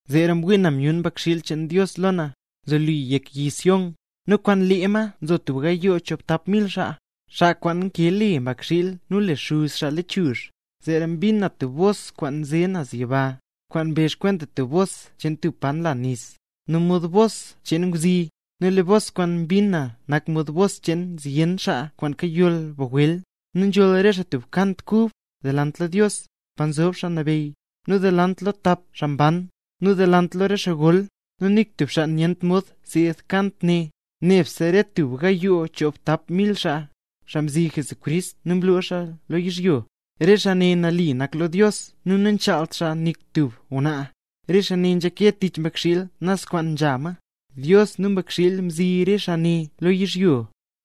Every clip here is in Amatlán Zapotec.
Zeera mwii na nu myun Mbakxiil cheen Dios lo na, nzoli yek yi Sión; nu kwaan lee ma nzo tub gayoo choobtap mil xaa, xaa kwaan nkee le Mbakxiil nu le Xuz xaa lechuzh. Zeera mbin na tub bos kwaan nze naz yiba, kwaan mbezh kwenta tub bos cheen tub pa nla nis, nu mod bos cheen ngwzi; nu lee bos kwaan mbin na nak mod bos cheen zyen xaa kwaan kayoll bagwel. Nu nzholl re xaa tub kant kub, delant lo Dios, pa nzob xaa nabeyy, nu delant lo tap xaa mban, nu delant lo re xaa gol; nu nik tub xaa nyent mod seed kant ne, nebse re tub gayoo choobtap mil xaa, xaa mzi Jesucrist nu mloo xaa lo yizhyo. Re xaa ne nali nak lo Dios nu namchaalt xaa nik tub ngwnaa. Re xaa ne nzhake tich Mbakxiil naz kwaana nzha ma. Dios nu Mbakxiil mzi re xaa ne lo yizhyo,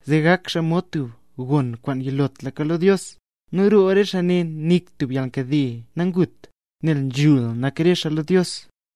zee gak xaa mod tub gon kwaan yilotlaka lo Dios. Nu roo re xaa ne nik tub yalnkade nangut; nel nzhul nak re xaa lo Dios.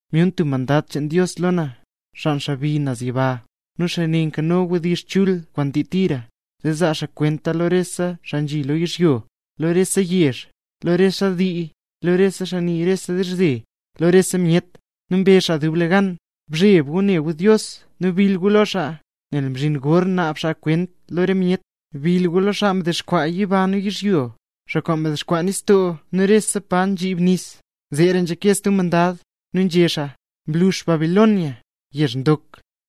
Myun stub mandad cheen Dios lo na, xaa nzebi naz yiba, nu xaa ne nkano wdizh chul kwaan ndii tira, zee zaa xaa kwenta lo rese xaa nzhi lo yizhyo, lo xaa rese yezh, lo xaa rese dii, lo xaa nii rese dizhze, lo rese myet. Nu mbezh xaa dublegan: —Bzheb gu ne gu Dios nu bill gu lo xaa, nel mzhinla gor naab xaa kwent lo rese myet. Bill gu lo xaa mdexkwaa yiba nu yizhyo, xaa kwaan mdexkwaa nistoo nu rese pa nzhib nis. Zeera nzhake stub mandad, nu nzhé xaa: —¡Mlux Babilonia, yezh ndok,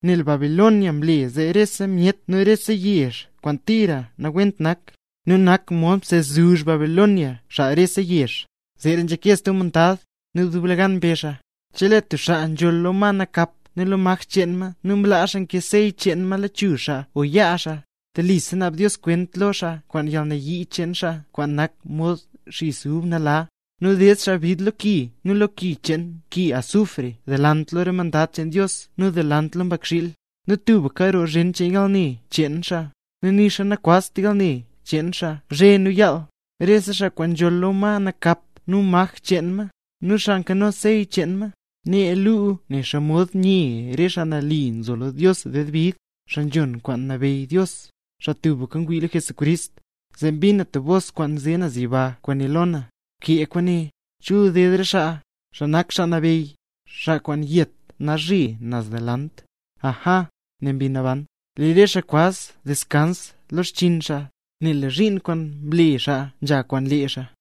nel Babilonia mle zee le rese myet rese yezh kwaan tira nawent nak, nu nak mod msezuzh Babilonia xaa rese yezh! Zeera nzhake stub mandad, nu dublegan mbezh xaa: —Chelee tub xaa nzholl lo ma nakap nu lo maj cheen ma nu mlaa xaa nkee sey cheen ma lechuzh xaa o yaa xaa, telisa naab Dios kwent cheen xaa kwaan yalnayii cheen xaa kwaan nak mod xis ub nala, nu ded xaa bid lo ki nu lo ki cheen ke azufre delant lo re mandad cheen Dios xaa nambey nak, nu delant lo Mbakxiil. Nu tubka roo zhen cheen yalne cheen xaa. Nu nixa nakwazt yalne cheen xaa zhe nu yaal, re xaa kwaan nzholl lo ma nakap nu maj cheen ma, nu xaa nkano sey cheen ma. Nee luu, nen xomod nye nzo re xaa mle nambey Jesús lo Dios ded bid, xaa nzhon kwaan nabeyy Dios, xaa tubka ngwii lo Jesucrist. Zee mbin na tub bos kwaan nze naz yiba kwaan né lo na: —Bkee kwaane: “Chul ded re xaa, xaa nak Xaa Nabeyy, xaa kwaan yet nalzhe naz delant”. —Aja —né Mbi Naban—, lee re xaa kwaz deskans lo xchiin xaa, nel lee re zhiin kwaan mle xaa nzha kwaan lee xaa.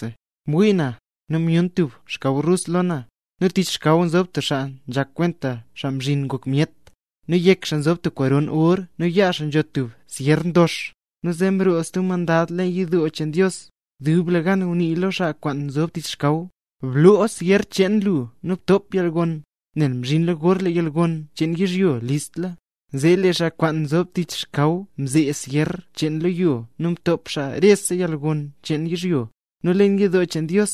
Mwii na, nu myun tub xkaw rus lo na; nu tich xkaw nzob tub xaa nzhak kwenta Xaa Mzhin Ngok Myet, nu yek xaa nzob tub koron or nu yaa xaa nzho tub syer ndox. Nu zee mroo stub mandad leen yidoo cheen Dios, dublegan ngunii lo xaa kwaan nzob tich xkaw: —¡Bloo syer cheen lu nu btop yalgon; nel mzhinla gor lee yalgon cheen yizhyo listla! Zee lee xaa kwaan nzob tich xkaw mzee syer cheen lo yo nu mtop xaa rese yalgon cheen yizhyo. Nu leen yidoo cheen Dios,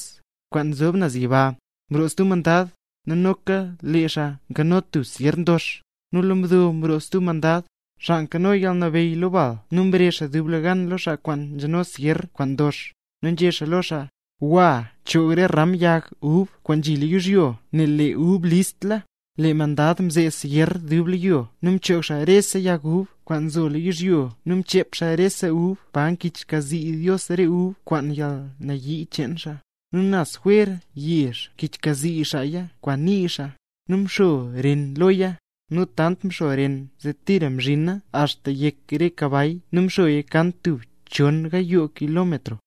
kwaan nzob naz yiba, mroo stub mandad, nu noka lee xaa mkano tub syer ndox. Nu lo mdo mroo stub mandad, xaa nkano yalnabeyy lo bal nu mrezh xaa dublegan lo xaa kwaan nzheno syer kwaan ndox, nu nzhé xaa lo xaa: —¡Gwa, choog re ram yag ub kwaan nzhi lo yizhyo nel lee re ub listla! Lee mandad mzee syer xaa dub lo yizhyo nu mchoog xaa rese yag ub, kwaan nzo lo yizhyo nu mchep xaa rese ub pa kichxkazii Dios re ub, kwaan yalnayii cheen xaa. Nu naz jwer yezh mkichxkazii xaaya kwaan nii xaa, nu mxo ren loya, nu tant mxo ren zee tira mzhina axta yek re kabay nu mxoya kan tub chon gayoo kilómetro.